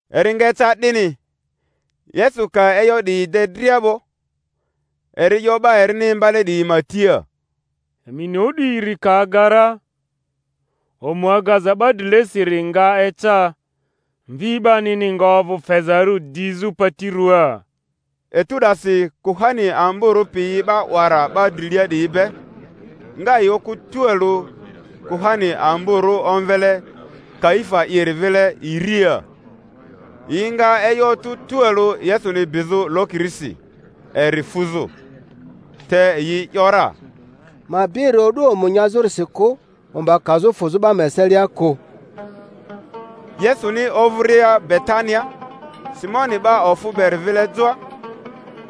Eri nga eca 'dini, Yesu ka e'yo 'diyi de dria 'bo, eri 'yo 'ba erini imbale 'diyi ma tia, Emi ni o'du iri ka aga ra, omu agaza 'ba drilesiri nga eca, Mvi 'banini nga ovᴜ fezarᴜ dizᴜ pati ruaa. Etu 'dasi kuhani amborᴜ piyi 'ba 'wara 'ba drilia 'diyi be, nga yi okᴜ tualᴜ kuhani amborᴜ omvele Kaifa'iri vile iriia, yi nga e'yo otᴜ tualᴜ Yesuni bizᴜ lokirisi, eri fuzᴜ. Te yi ‘yora, Ma bi eri o'du omu nyazᴜrisi kᴜ, omba kazᴜ fᴜzᴜ 'ba ma eselia kᴜ. Yesuni ovᴜria Betania, Simoni 'ba ofᴜ beri vile joa,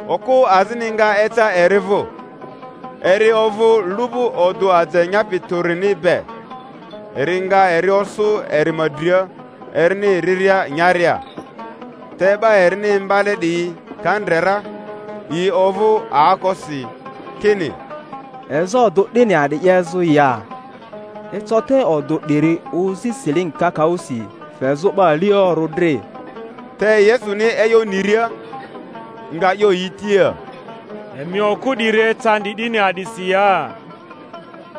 okᴜ azini nga eca eri vᴜ, eri ovᴜ lu'bu odᴜ aje nyapi tᴜrini be, eri nga eri osᴜ eri ma dria erini riria nyaria. Te 'ba erini imbale 'diyi ka ndre ra, yi ovᴜ aokosi, kini, Eza odᴜ 'dini a'di 'yezᴜ ya? Eco te odᴜ 'diri ozi silingi kakaᴜsi, fezᴜ 'ba aliorᴜ dri. Te Yesuni e'yo niria, nga 'yo yi tia, Emi okᴜ 'diri ecandi 'dini a'disi ya?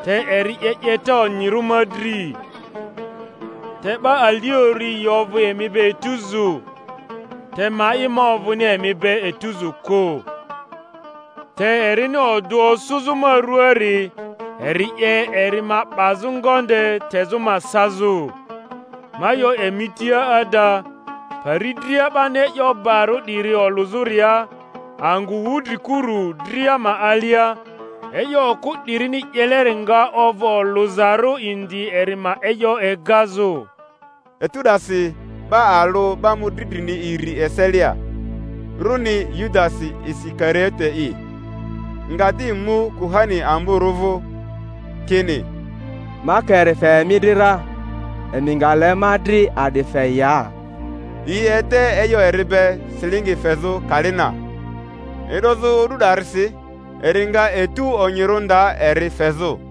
Te eri 'ye 'yeta onyirᴜ ma dri. Te 'ba aliorᴜ yi ovᴜ emi be etuzu, te ma'i, ma ovᴜni emi be etuzu kᴜ. Te erini odᴜ osᴜzᴜ ma ruaari, eri 'ye eri ma 'bazᴜ ngonde tezᴜ ma sazᴜ. Ma 'yo emi tia ada, pari dria 'bani e'yo barᴜ 'diri olᴜzᴜria angᴜ wudrikurᴜ dria ma alia, e'yo okᴜ 'dirini 'yeleri nga ovᴜ olᴜzarᴜ indi eri ma e'yo egazᴜ. Etu 'dasi 'ba alᴜ 'ba mᴜdri drini iri eselia, runi Yudasi Isikariote'i, nga di mu kuhani amborᴜ vᴜ, kini, Ma ka eri fe emi dri ra, emi nga le ma dri a'di fe ya? Yi ede e'yo eri be silingi fezᴜ kali na. E'dozᴜ o'du 'darisi eri nga etu onyirᴜ nda eri fezᴜ.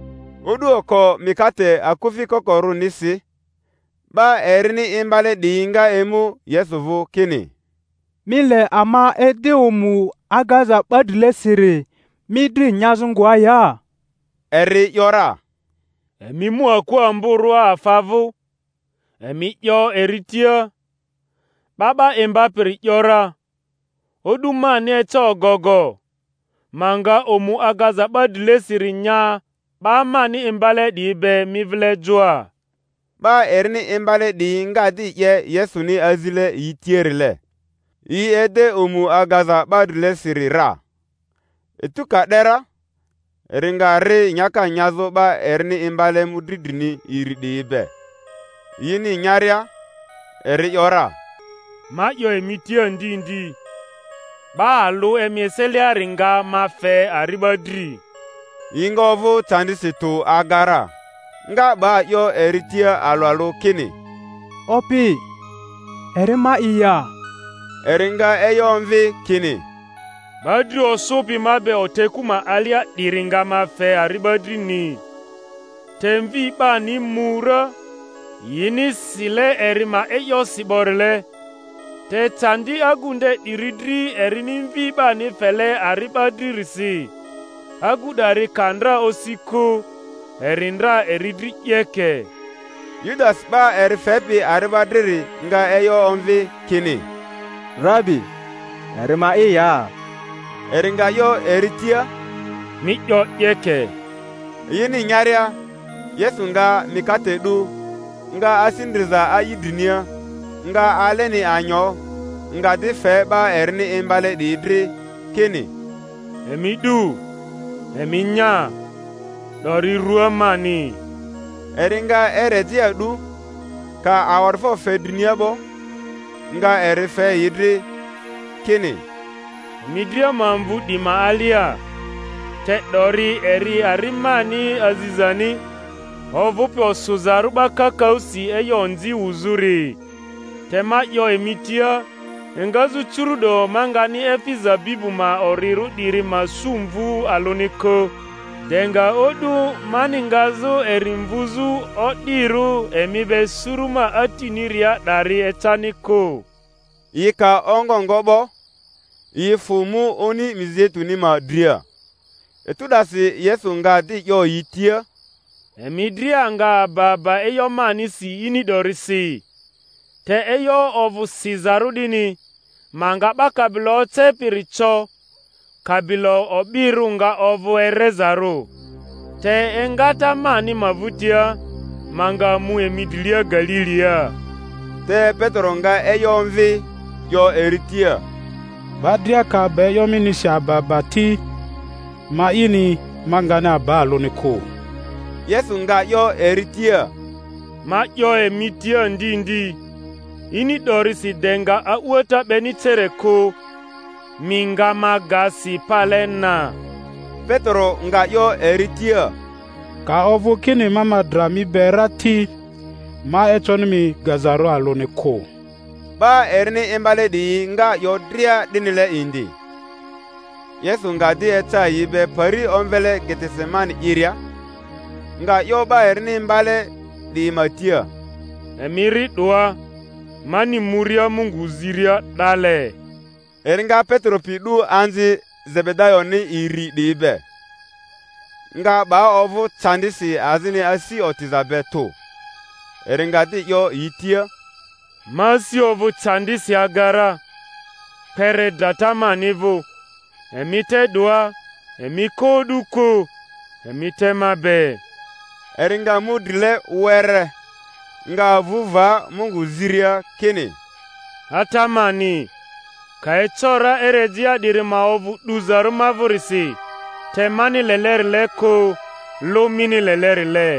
O'du oko mikate akufi kokorᴜnisi, 'ba erini imbale 'diyi nga emu Yesu vᴜ, kini, Mi le ama ede omu agaza 'ba drilesiri mi dri nyazᴜ ngoa ya? Eri ‘yora, Emi mu aku amborᴜa afa vᴜ, emi 'yo eri tia, 'Ba 'ba Imbapiri ‘yora, O'du mani eca ogogo; ma nga omu agaza 'ba drilesiri nya 'ba mani imbale 'diyi be mi vile joa. 'Ba erini imbale 'diyi nga di 'ye Yesuni azile yi tiarile; yi ede omu agaza 'ba drilesiri ra. Etu ka 'de ra, eri nga ri nyaka nyazᴜ 'ba erini imbale mᴜdri drini iri 'diyi be; yini nyaria, eri ‘yora, Ma 'yo emi tia ndi ndi, 'ba alᴜ emi eseliari nga ma fe ari'ba dri. Yi nga ovᴜ candisi tᴜ aga ra, nga 'ba 'yo eri tia alᴜ alᴜ, kini, Opi, eri ma'i ya? Eri nga e'yo omvi kini, 'Ba dri osᴜpi ma be oteku ma alia 'diri nga ma fe ari'ba drini. Te Mvi 'bani mu ra, yini sile eri ma e'yosi 'borile, te candi agu nde 'diri dri erini Mvi 'bani fele ari'ba dririsi! Agu 'dari ka ndra osi kᴜ, eri ndra eri dri 'yeke. Yudasi 'ba eri fepi ari'ba driri nga e'yo omvi kini, Rabi, eri ma'i ya? Eri nga 'yo eri tia, Mi 'yo 'yeke. Yini nyaria, Yesu nga mikate 'du, nga asi ndriza a'i drinia, nga aleni anyo, nga di fe 'ba erini imbale 'diyi dri, kini, Emi 'du, emi nya; 'dori rua mani. Eri nga erejea 'du, ka awa'difo fe drinia 'bo, nga eri fe yi dri, kini, Emi dria ma mvᴜ 'di ma alia; te 'dori eri ari mani azizani, ovᴜpi osᴜzarᴜ 'ba kakaᴜsi e'yo onzi wuzᴜri. Te ma 'yo emi tia, engazᴜ curu'do ma ngani efi zabibu ma orirᴜ 'diri ma su mvu alᴜni kᴜ, de nga o'du mani ngazᴜ eri mvuzᴜ o'dirᴜ emi be suru ma Atiniria 'dari ecani kᴜ. Yi ka ongo ngo 'bo, yi fᴜ mu oni Mizeituni ma dria. Etu 'dasi Yesu nga di 'yo yi tia, Emi dria nga aba aba e'yo manisi ini 'dorisi; te e'yo ovᴜ sizarᴜ 'dini, Ma nga 'ba kabilo ocepiri co, kabilo o'birᴜ nga ovᴜ erezarᴜ. Te engata mani ma vᴜtia, ma nga mu emi drilia Galilia. Te Petero nga e'yo omvi, 'yo eri tia, 'Ba dria ka aba e'yo minisi aba aba ti, ma'ini, ma ngani aba alᴜni kᴜ. Yesu nga 'yo eri tia, Ma 'yo emi tia ndi ndi, ini 'dorisi de nga a'uata 'beni cere kᴜ, mi nga ma ga si pale na. Petero nga 'yo eri tia, Ka ovᴜ kini ma ma dra mi be ra ti, ma econi mi gazarᴜ alᴜni kᴜ. Ba erini imbale 'diyi nga 'yo dria 'dinile indi. Yesu nga di eca yi be pari omvele Getesemani'iria, nga 'yo 'ba erini imbale 'diyi ma tia, Emi ri 'doa, mani muria Mungu ziria 'dale. Eri nga Petero pi 'du anzi Zebedayoni iri 'diyi be, nga 'ba ovᴜ candisi azini asi otiza be tᴜ. Eri nga di 'yo yi tia, Ma asi ovᴜ candisi aga ra, kpere drata mani vᴜ; emi te 'doa, emi ko o'du kᴜ, emi te ma be. Eri nga mu drile were, nga avᴜ va Mungu ziria, kini, Ata mani, ka eco ra erejea 'diri ma ovᴜ 'duzarᴜ ma vᴜrisi; te mani lelerile kᴜ, lᴜ mini lelerile.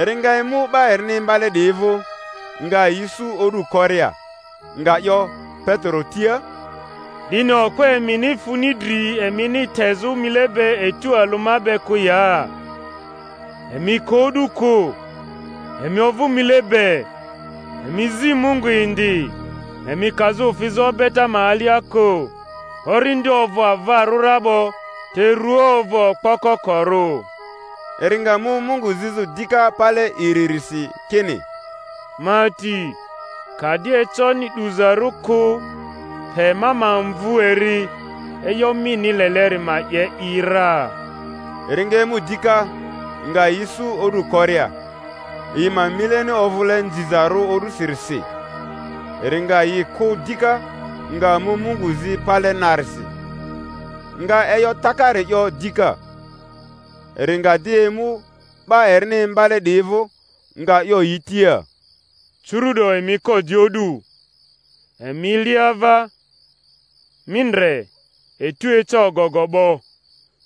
Eri nga emu 'ba erini imbale 'diyi vᴜ, nga yi isu o'du koria, nga 'yo Petero tia, Dini okpo emini funi dri emini tezᴜ mile be etu alᴜ ma be kᴜ ya? Emi ko o'du kᴜ, emi ovᴜ mile be, emi zi Mungu indi, emi kazᴜ fizᴜ obeta ma alia kᴜ; orindi ovᴜ avarᴜ ra 'bo, te rua ovᴜ okpo kokorᴜ. Eri nga mu Mungu zizᴜ dika pale iririsi, kini, Ma Ati, ka di econi 'duzarᴜ kᴜ pe ma ma mvᴜ eri, e'yo mini leleri ma 'ye i ra. Eri nga emu dika, nga yi isu o'du koria, yi ma mileni ovᴜle nzizarᴜ o'dusirisi. Eri nga yi kᴜ dika, nga mu Mungu zi pale narisi, nga e'yo takari 'yo dika. Eri nga di emu 'ba erini imbale 'diyi vᴜ, nga 'yo yi tia, Cᴜru'do emi ko di o'du, emi li ava; mi ndre, etu eca ogogo 'bo,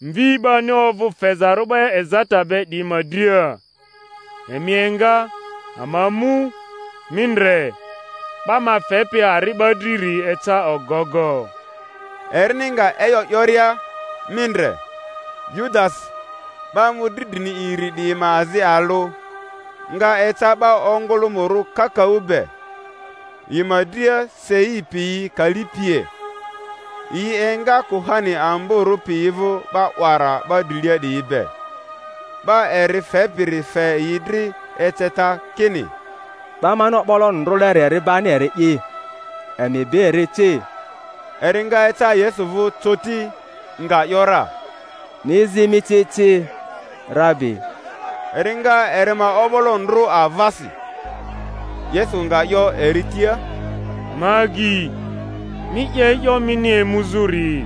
Mvi 'bani ovᴜ fezarᴜ 'ba ezata be 'diyi ma dria. Emi enga, ama mu; mi ndre, 'ba ma fepi ari'ba driri eca ogogo. Erini nga e'yo 'yoria, mi ndre, Yudasi, 'ba mᴜdri drini iri 'diyi ma azi alᴜ, nga eca 'ba ongolᴜmᴜrᴜ kakaᴜ be, yi ma dria sei piyi kali pie, yi enga kuhani amborᴜ piyi vᴜ 'ba 'wara 'ba drilia 'diyi be. 'Ba eri fepiri fe yi dri eceta, kini, 'Ba mani o'boloni ndrᴜleri eri bani eri'i; emi bi eri ci. Eri nga eca Yesu vᴜ coti, nga ‘yora, Mi zi mi ci ci, Rabi! Eri nga eri ma o'bolo ndrᴜ avasi. Yesu nga 'yo eri tia, Ma agyi, mi 'ye e'yo mini emuzᴜri.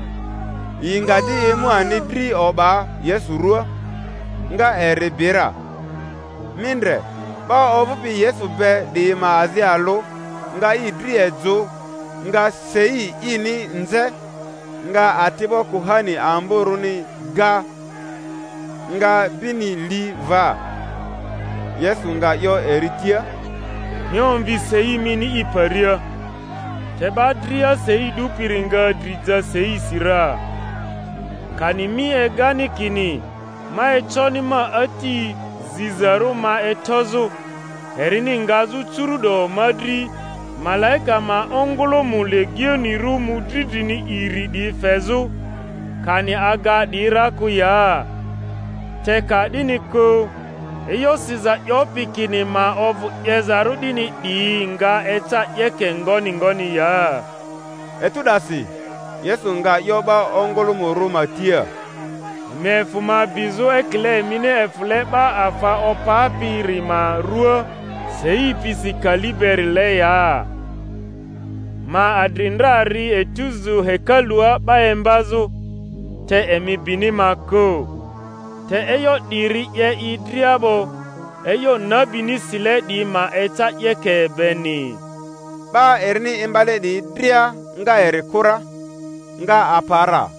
Yi nga di emu ani dri o'ba Yesu ruaa, nga eri bi ra. Mi ndre, 'ba ovᴜpi Yesu be 'diyi ma azi alᴜ nga i dri ejᴜ, nga sei ini nze, nga ati'bo kuhani amborᴜni ga, nga bini li va. Yesu nga 'yo eri tia, Mi omvi sei mini i paria; te 'ba dria sei 'dupiri nga dri ja seisi ra. Kani mi egani kini ma econi ma Ati zizarᴜ ma etozᴜ, erini ngazᴜ curu’do ma dri malaika ma ongᴜlᴜmᴜ legionirᴜ mᴜdri drini iri 'diyi fezᴜ, kani aga 'diyi ra kᴜ ya? Te ka 'dini kᴜ, e'yo siza 'yopi kini ma ovᴜ 'yezarᴜ 'dini 'diyi nga eca 'yeke ngoni ngoni ya? Etu 'dasi Yesu nga 'yo 'ba ongᴜlᴜmᴜrᴜ ma tia, Emi efᴜ ma bizᴜ ekile emini efᴜle 'ba afa opapiri ma ruaa, sei pisi kali berile ya? Ma adri ndra ri etuzu hekalua 'ba imbazᴜ, te emi bini ma kᴜ. Te e'yo 'diri 'ye i dria 'bo, e'yo nabini sile 'diyi ma eca 'yeke beni. 'Ba erini imbale 'diyi dria nga eri kᴜ ra, nga apa ra.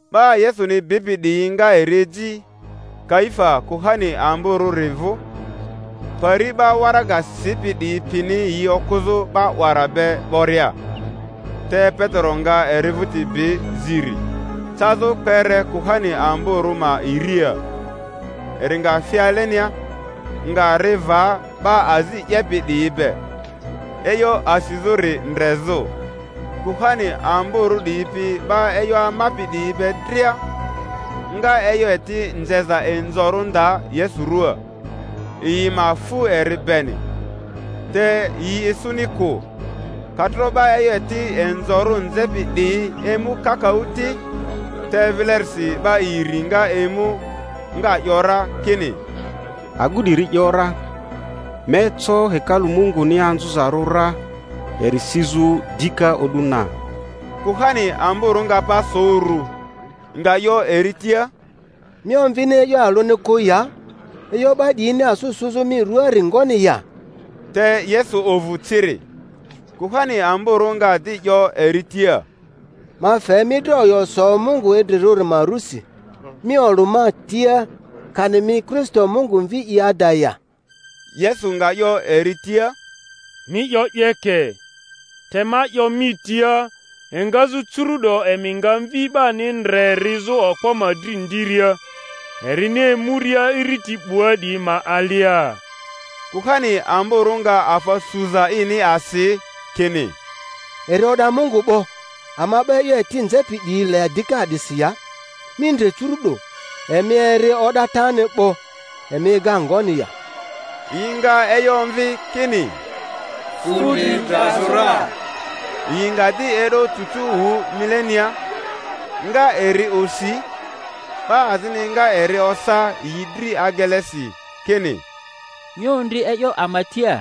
'Ba Yesuni bipi 'diyi nga eri eji Kaifa kuhani amborᴜri vᴜ, pari 'ba waraga sipi 'diyi pini yi okᴜzᴜ 'ba 'wara be 'boria. Te Petero nga eri vᴜti bi ziri, cazᴜ kpere kuhani amborᴜ ma iriia, eri nga fi alenia, nga ri va 'ba azi 'yepi 'diyi be, e'yo asizᴜri ndrezᴜ. Kuhani amborᴜ 'diyi pi 'ba e'yo amapi 'diyi be dria nga e'yo eti nzeza inzorᴜ nda Yesu ruaa, yi ma fu eri beni, te yi isuni kᴜ, ka tro 'ba e'yo eti inzorᴜ nzepi 'diyi emu kakaᴜ ti. Te vilerisi 'ba iri nga emu, nga 'yo ra kini, Agu 'diri ‘yora, Ma eco hekalu Munguni anzᴜzarᴜ ra, eri sizᴜ dika o'du na. Kuhani amborᴜ nga pa so uru, nga 'yo eri tia, Mi omvini e'yo alᴜni kᴜ ya? E'yo 'ba 'diyini asᴜ sᴜzᴜ mi ruaari ngoni ya? Te Yesu ovᴜ ciri. Kuhani amborᴜ nga di 'yo eri tia, Ma fe mi dri oyo so Mungu idrirᴜ ma rusi, mi olᴜ ama tia, kani mi Kristo Mungu Mvi'i ada ya? Yesu nga 'yo eri tia, Mi 'yo 'yeke. Te ma 'yo mi tia, engazᴜ curu’do emi nga Mvi 'bani ndre rizᴜ Okpo ma dri ndiria, erini emuria iriti 'bua 'diyi ma alia. Kuhani amborᴜ nga afa suza ini asi, kini, Eri o'da Mungu 'bo. Ama 'ba e'yo eti nzepi 'diyi le dika a'disi ya? Mi ndre curu'do, emi eri o'datani 'bo. Emi ega ngoni ya? Yi nga e'yo omvi kini, Fu dri drazᴜ ra. Yi nga di e'do cucu wᴜ milenia, nga eri osi; 'ba azini nga eri osa yi dri agelesi, kini, Mi ondri e'yo ama tia,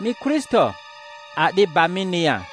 mi Kristo! A'di gba mini ya?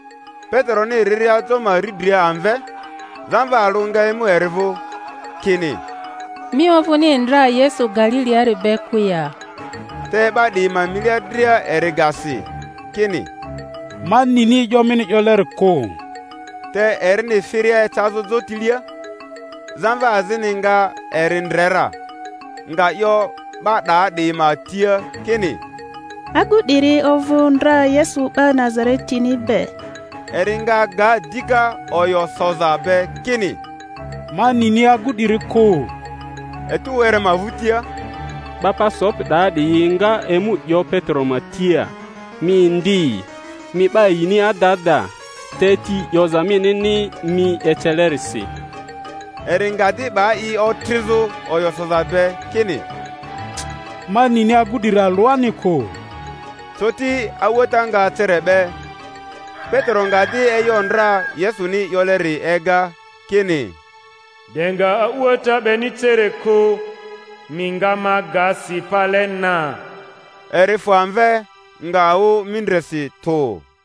Peteroni riria jo ma riidria amve, zamva alᴜ nga emu eri vᴜ, kini, Mi ovᴜni ndra Yesu Galiliari be kᴜ ya? Te 'ba 'diyi ma milia dria eri ga si, kini, Ma nini e'yo mini 'yoleri kᴜ. Te erini firia ecazᴜ jotilia, zamva azini nga eri ndre ra, nga 'yo 'ba 'daa 'diyi ma tia, kini, Agu 'diri ovᴜ ndra Yesu 'ba Nazaretini be. Eri nga ga dika oyo soza be, kini, Ma nini agu 'diri kᴜ. Etu were ma vᴜtia, 'ba pa sopi 'daa 'diyi nga emu 'yo Petero ma tia, Mi indi, mi 'ba yini ada ada, te ti 'yoza minini mi ecelerisi. Eri nga di 'ba i otrizᴜ oyo soza be, kini, Ma nini agu 'diri alᴜani kᴜ. Coti a'uata nga cere 'be. Petero nga di e'yo ndra Yesuni 'yoleri ega, kini, De nga a'uata 'beni cere kᴜ mi nga ma ga si pale na. Eri fᴜ amve, nga wᴜ mindresi tᴜ.